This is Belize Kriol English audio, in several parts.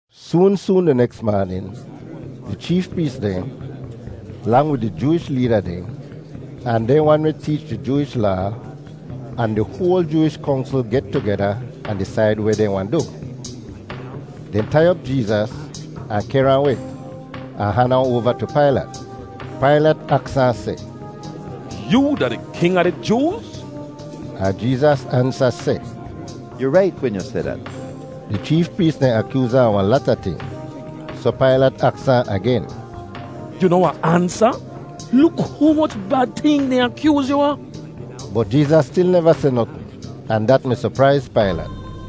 Soon soon di neks maanin, di cheef prees dehn, lang wid di Jooish leeda dehn, ahn dehn wan weh teech di Jooish Laa, ahn di hoal Jooish Kongsl get tugeda ahn disaid weh dehn wahn du. Dehn tai op Jeezas, ahn kehr ahn weh, ahn han ahn oava tu Pailat. Pailat aks ahn seh, “Yoo da di king a di Jooz?” Ahn Jeezas ansa seh, “Yu rait wen yu seh dat.” Di cheef prees dehn akyooz ahn a wahn lata ting. Soh Pailat aks ahn agen, “Yu noh wahn ansa? Luk humoch bad ting dehn akyooz yu a.” Bot Jeezas stil neva seh notn, ahn dat mi sopraiz Pailat.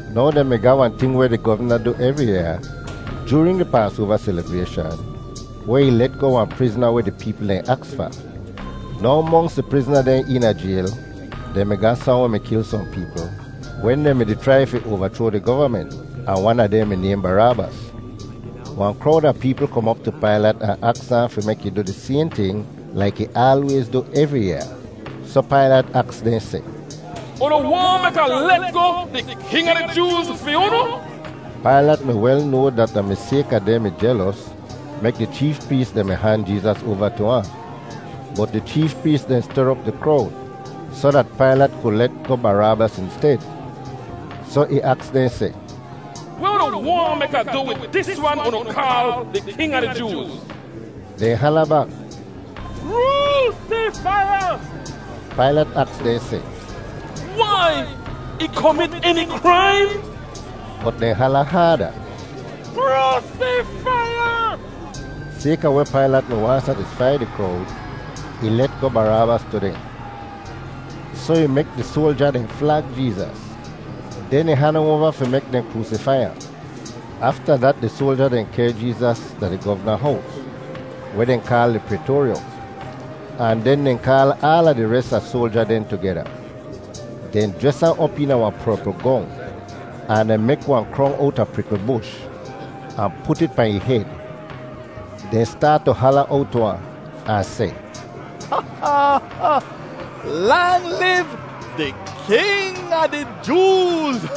Now dehn mi ga wahn ting weh di govna du evri yaa joorin di Paasoava selibrayshan weh ih let goh wahn prizna weh di peepl dehn aks fa. Now monks di prizna dehn eena jayl, dehn mi ga sohn weh mi kil sohn peepl wen dehn mi-di chrai fi oavachroa di govament, ahn wan a dehn mi nayhn Baraabas. Wahn krowd a peepl kom op tu Pailat ahn aks ahn fi mek ih du di sayhn ting laik ih aalwayz du evri yaa. Soh Pailat aks dehn seh, “Unu waahn mek Ah let goh ‘di king a di Jooz’ fi unu?” Pailat mi wel noa dat da mi sayka dehn mi jelos mek di cheef prees dehn mi han Jeezas oava tu ahn. Bot di cheef prees dehn ster op di krowd soh dat Pailat ku let goh Baraabas insted. Soh ih aks dehn seh, “Weh unu waahn mek Ah du wid dis wan unu kaal di king a di Jooz?” Dehn hala bak, “Kroosifai ahn!” Pailat aks dehn seh, “Wai? Ih komit eni kraim?” Bot dehn hala haada, “Kroosifai ahn!” Sayka weh Pailat mi waahn satisfai di krowd, ih let goh Baraabas tu dehn. Soh ih mek di soalja dehn flag Jeezas. Den ih han ahn oava fi mek dehn kroosifai ahn. Afta dat di soalja dehn kehr Jeezas da di govna hows (weh dehn kaal di Praytoaryom) ahn den dehn kaal aala di res a soalja dehn tugeda. Dehn jres ahn op eena wahn perpl gong, ahn dehn mek wahn krong owta prikl bush, ahn put it pahn ih hed. Dehn staat tu hala owt tu ahn, ahn seh, “Lang liv di king a di Jooz!”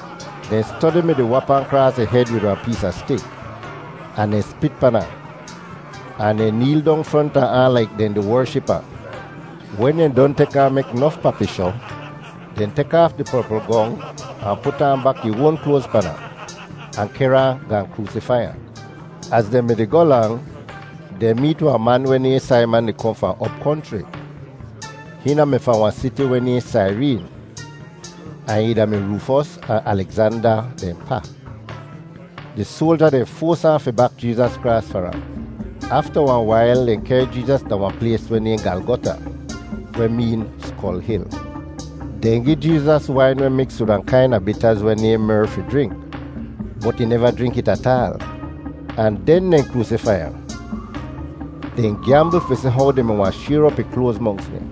Dehn stodi mi-di wap ahn kraas ih hed wid wahn pees a stik, ahn dehn spit pan ahn, ahn dehn neel dong fronta ahn laik dehn di wership ahn. Wen dehn don tek ahn mek nof papishoh, dehn tek aaf di perpl gong ahn put aan bak ih oan kloaz pan ahn, ahn kehr ahn gaahn kroosifai ahn. Az dehn mi-di goh lang, dehn meet wahn man weh nayhn Saiman di kohn fahn op konchri. Hihn da-mi fahn wahn siti weh nayhn Saireen, ahn ih da-mi Roofos ahn Alegzanda dehn pa. Di soalja dehn foas ahn fi bak Jeezas kraas far ahn. Afta wahn wail dehn kehr Jeezas da wahn plays weh nayhn Galgota, weh meen “Skol Hil.” Dehn gi Jeezas wain weh miks wid wahn kaina bitaz weh nayhn mer fi jrink, bot ih neva jrink it ataal. Ahn den dehn kroosifai ahn! Dehn gyambl fi si how dehn mi wahn shayr op ih kloaz monks dehn.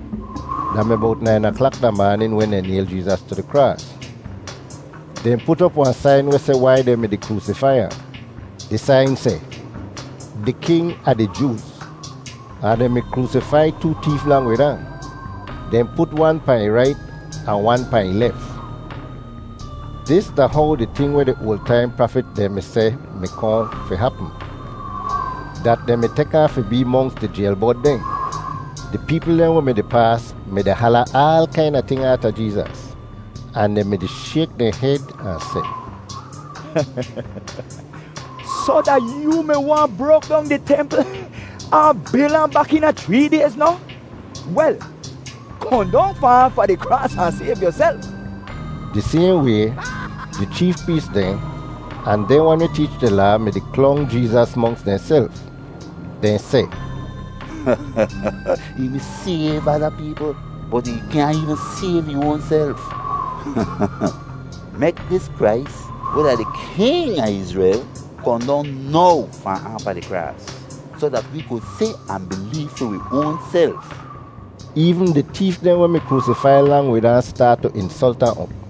Da mi bowt nain aklak da maanin wen dehn nayl ahn tu di kraas. Dehn put op wahn sain weh seh wai dehn mi-di kroosifai ahn. Di sain seh: DI KING A DI JOOZ. Ahn dehn mi kroosifai too teef lang wid ahn. Dehn put wan pahn ih rait ahn wan pahn ih lef. [Dis da how di ting weh di oal taim prafit dehn mi seh mi kohn fi hapm, dat dehn mi tek ahn fi bee monks di jayl bod dehn.] Di peepl dehn weh mi-di paas mi-di hala aal kaina ting aata Jeezas, ahn dehn mi-di shayk dehn hed ahn seh, “Soh, da yoo mi wahn brok dong di templ ahn bil ahn bak eena chree dayz noh? Wel, kohn dong fahn aafa di kraas ahn sayv yuself!” Di sayhn way, di cheef prees dehn ahn dehn wan weh teech di Laa mi-di klong Jeezas monks dehnself. Dehn seh, “Ih mi sayv ada peepl, bot ih kyaahn eevn sayv ih oanself. Mek dis Krais, weh da di King a Izrel, kohn dong now fahn aafa di kraas soh dat wi ku si ahn bileev fi wi oanself.” Eevn di teef dehn weh mi kroosifai lang wid ahn staat tu insolt ahn op.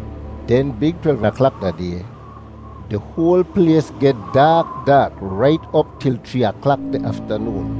Den big twelv aklak da day di hoal plays geh daak daak rait op til chree aklak di aftanoon.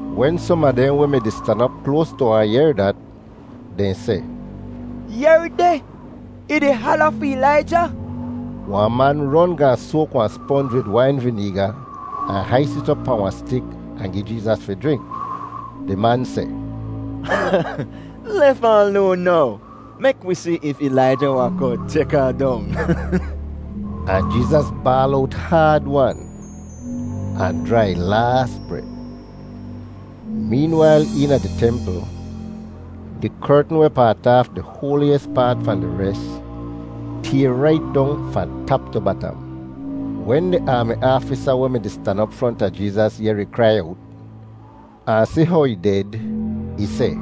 Wen som a dehn weh mi-di stan op kloas tu ahn yehr dat, dehn seh, “Yehr deh, ih di hala fi Ilaija.” Wahn man ron gaahn soak wahn sponj wid wain vineega ahn hais it op pahn wahn stik ahn gi Jeezas fi jrink. Di man seh, “Lef ahn loan now. Mek wi si if Ilaija wahn kohn tek ahn dong.” Ahn Jeezas baal owt haad-wan ahn jraa ih laas bret. Meenwail eena di templ di kertn weh paat aaf di hoaliyis paat fahn di res tayr rait dong fahn tap tu batam. Wen di aami aafisa weh mi-di stan op fronta Jeezas yehr ih krai owt, ahn si how ih ded, ih seh,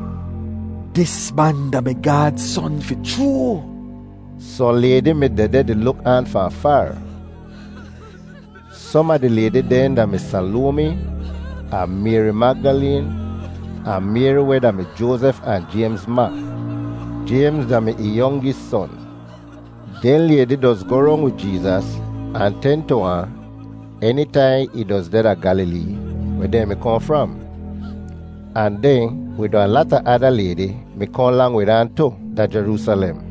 “Dis man da-mi Gaad Son fi chroo!” Sohn laydi mi dehdeh di luk aan fahn faar. Som a di laydi dehn da-mi Salomi, ahn Mayri Magdaleen, ahn Mayri weh da-mi Joazef ahn Jaymz ma. (Jaymz da-mi ih yongis son.) Dehn laydi doz goh rong wid Jeezas ahn ten tu ahn enitaihn ih doz deh da Gyalilee, weh dehn mi kohn fram. Ahn dehn, wid wahn lata ada laydi, mi kohn lang wid ahn tu, da Jeroosalem.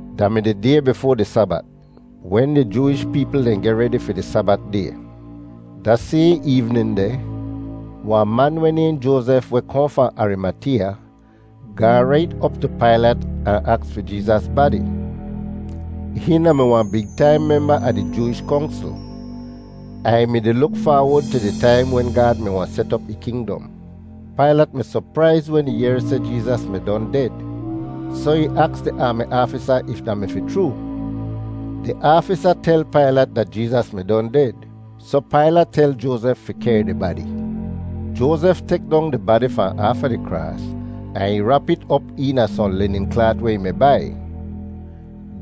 Da mi di day bifoa di Sabat, wen di Jooish peepl dehn geh redi fi di Sabat day. Da sayhn eevnin deh wahn man weh nayhn Joazef weh kohn fahn Arimateeya, gaahn rait op tu Pailat ahn aks fi Jeezas badi. Hihn da-mi wahn big taim memba a di Jooish Kongsl, ahn ih mi-di luk faawod tu di taim wen Gaad mi wahn set op ih kingdom. Pailat mi sopraiz wen ih yehr seh Jeezas mi don ded, soh ih aks di aami aafisa if da mi fi chroo. Di aafisa tel Pailat dat Jeezas mi don ded soh Pailat tel Joazef fi kehr di badi. Joazef tek dong di badi fahn aafa di kraas ahn ih rap it op eena sohn linin klaat weh ih mi bai.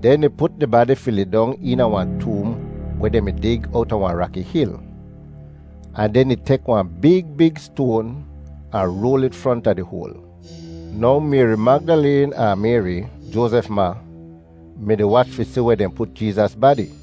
Den ih put di badi fi lidong eena wahn toom weh dehn mi dig owta wahn raki hil. Ahn den ih tek wahn big big stoan ahn roal it fronta di hoal. Now Mayri Magdaleen ahn Mayri, Joazef ma, mi-di wach fi si weh dehn put Jeezas badi.